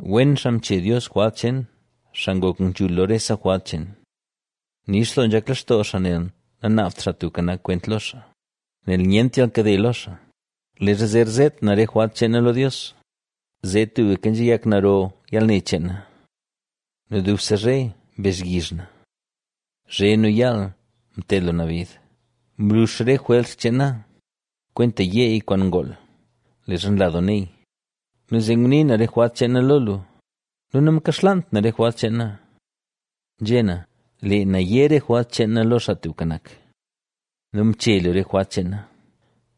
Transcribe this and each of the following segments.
Wen xaa mche Dios jwalt cheen, xaa ngok nzhul lo rese jwalt cheen. Nix doo nzhak lextoo xaa nel nanaabt Xaa Tubka Nak kwent lo xaa, nel nyent yalkade lo xaa. Leezha zer zeet na re jwalt cheen na lo Dios, zee tubka nzhayak naro yalne cheen na nu dubse zhe mbezhyizh na. Zhe nu yaal mted lu na bid, mlux re jwers cheen na, kwenta yeey kwaan ngool, leezha nla doo neey. Nu zee nguni na jwalt cheen na lo lu nu namkaxlaant na re jwalt cheen na. Nzhé na: “Lee na yé re jwalt cheen na lo Xaa Tubka Nak” nu mche lu re jwalt cheen na.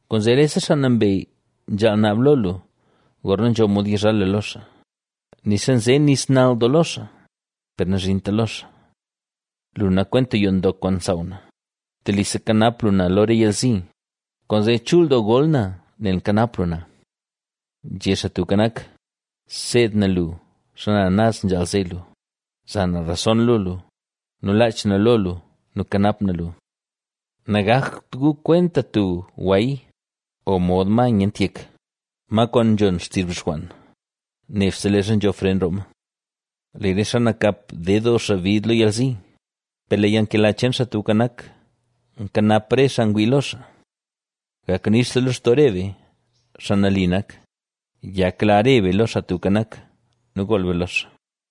Kwaanzee rese xaa nambey nzhaal naab lo lu, gorna nzho mod yizhal lu lo xaa, nixa nze nis nal doo lo xaa, per nazhinta lo xaa. Lu nak kwenta yoo ndok kwaan nsaaw na, telise kanap lu na lo re yalzi, kwaanzee chul doo gol na nel mkanap lu na. Nzhé Xaa Tubka Nak: “Seed na lu xana naz nzhaal ze lu, za na rason lo lu, nu laach na lo lu nu kanap na lu. Nagakt gu kwenta tub gway, o mod ma nyent yek, ma kwaan nzhon xtizh bixwann, nebse leezha nzho fren roo ma.” Lee re xaa nakap ded doo bid lo yalzi, per lee yalnkela cheen Xaa Tubka Nak, nkanap re xaa ngwii lo xaa. Gak nix doo lextoo re be, xaa nali nak, yakla re be lo Xaa Tubka Nak nu gool be lo xaa.